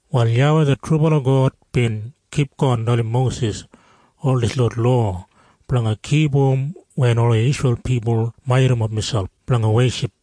Wal YAWEI det trubala God bin kipgon dalim Mosis ol dislot lowa blanga kipum wen ola Isreil pipul majurrumap miselp blanga weship.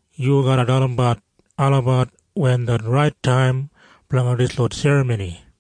Yu garra dalimbat olabat wen det rait taim blanga dislot serramoni.”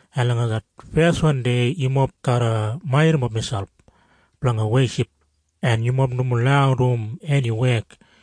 En langa det feswan dei yumob garra majurrumap miselp blanga weship en yumob nomo lau dum eni wek.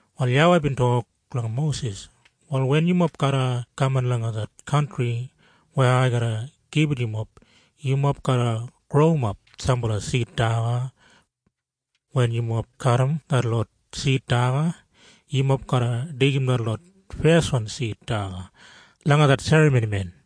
Wal YAWEI bin tok langa Mosis, “Wal wen yumob garra kaman langa det kantri weya ai garra gibit yumob, yumob garra growimap sambala sid daga. Wen yumob kadim detlot sid daga, yumob garra deigim detlot feswan sid daga langa det serramonimen.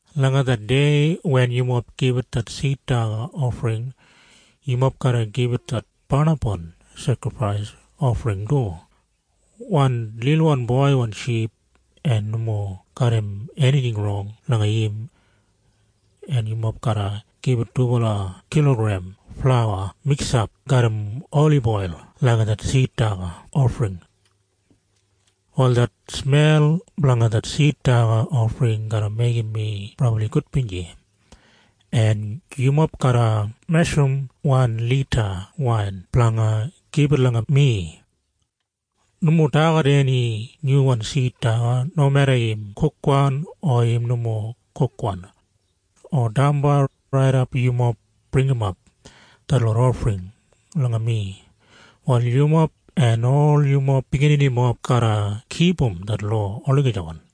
Langa det dei wen yumob gibit det sid daga ofring, yumob garra gibit det barnapwan sekrifais ofring du, wan lilwan boiwan ship en nomo garram enijing rong langa im. En yumob garra gibit dubala kilogrem flauwa miksap garram oliboil langa det sid daga ofring. Wal det smel blanga det sid daga ofring garra meigim mi brabli gudbinji. En yumob garra meshurum wan lita wain blanga gibit langa mi. Nomo dagat eni nyuwan sid daga, nomeda im kukwan, o im nomo kukwan, o damba, raidap yumob bringimap detlot ofring langa mi. Wal yumob en ol yumob bigininimob garra kipum det lowa olagijawan.”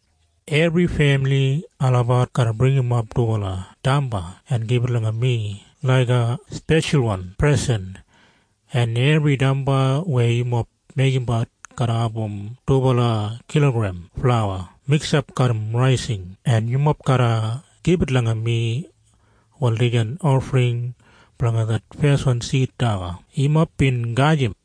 Ebri femili olabat garra bringimap dubala damba en gibit langa mi laiga speshalwan presen. En ebri damba weya yumob meigimbat garra abum dubala kilogrem flauwa miksap garram raising en yumob garra gibit langa mi. Wal dijan ofring blanga det feswan sid daga yumob bin gajim.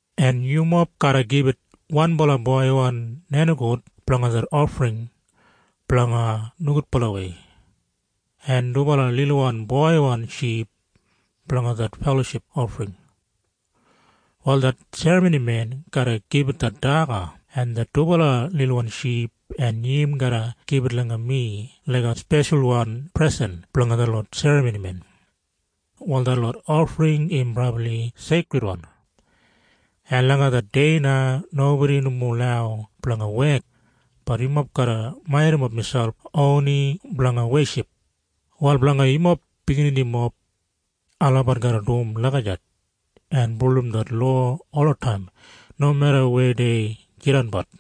En yumob garra gibit wanbala boiwan nenigout blanga det ofring blanga nogudbalawei, en dubala lilwan boiwan ship, blanga det feloship ofring. Wal det serramonimen garra gibit det daga en det dubala lilwan ship en im garra gibit langa mi laiga speshalwan presen blanga detlot serramonimen. Wal detlot ofring im brabli seikridwan. En langa det dei na, nobodi nomo lau blanga wek, bat yumob garra majurrumap miselp oni blanga weship. Wal blanga yumob bigininimob, olabat garra dum lagijat en bulurrum det lowa olataim nomeda weya dei jidanbat.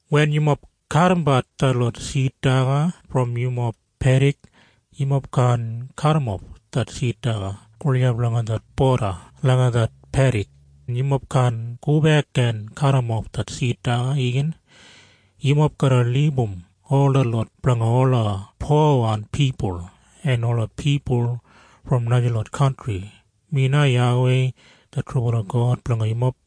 “Wen yumob kadimbat detlot sid daga brom yumob pedik, yumob kaan kadimof det sid daga gulijap langa det boda langa det pedik, en yumob kaan gobek en kadimof det sid daga igin. Yumob garra libum ol detlot blanga ola powan pipul en ola pipul brom najalot kantri. Mi na YAWEI det trubala God blanga yumob.”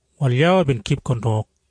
Wal YAWEI bin kipgon tok,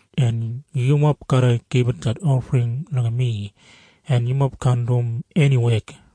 En yumob garra gibit det ofring langa mi en yumob kaan dum eni wek.”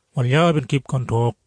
Wal YAWEI bin kipgon tok,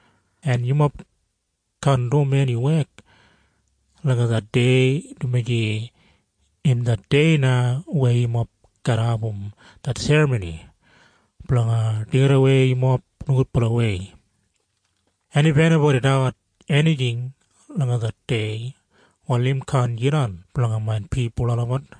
En yumob kaan dum eni wek langa det dei, dumaji im det dei na weya yumob garra abum det Serramoni blanga Deigidawei yumob Nogudbalawei. En if enibodi dagat enijing langa det dei wal im kaan jidan blanga main pipul olabat.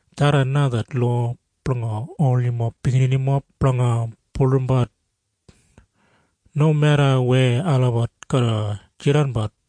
Tharran na det lowa blanga ol yumob bigininimob blanga bulurrumbat, nomeda weya olabat garra jidanbat.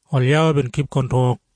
Wal YAWEI bin kipgon tok,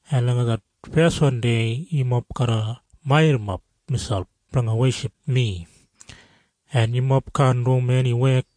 En langa det feswan dei yumob garra majurrumap miselp blanga weship mi, en yumob kaan dum eni wek.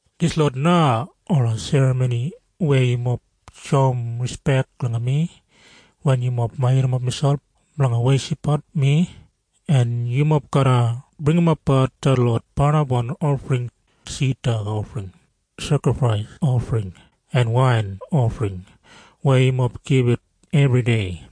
“Dislot na ola serramoni weya yumob shoum rispek langa mi wen yumob majurrumap miselp blanga weshipbat mi, en yumob garra bringimapbat detlot barnapwan ofring, sid daga ofring, sekrifais ofring, en wain ofring weya yumob gibit ebridei.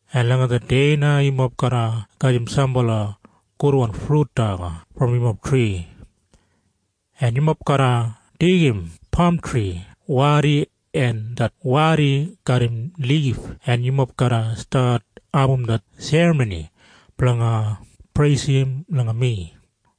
En langa det dei na yumob garra gajim sambala gudwan frut daga brom yumob tri, en yumob garra deigim pamtri wadi, en det wadi garram lif en yumob garra stat abum det serramoni blanga preisim langa mi.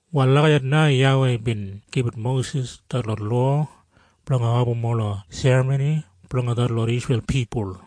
Wal lagijat na YAWEI bin gibit Mosis detlot lowa blanga abum ola serramoni blanga detlot Isreil pipul.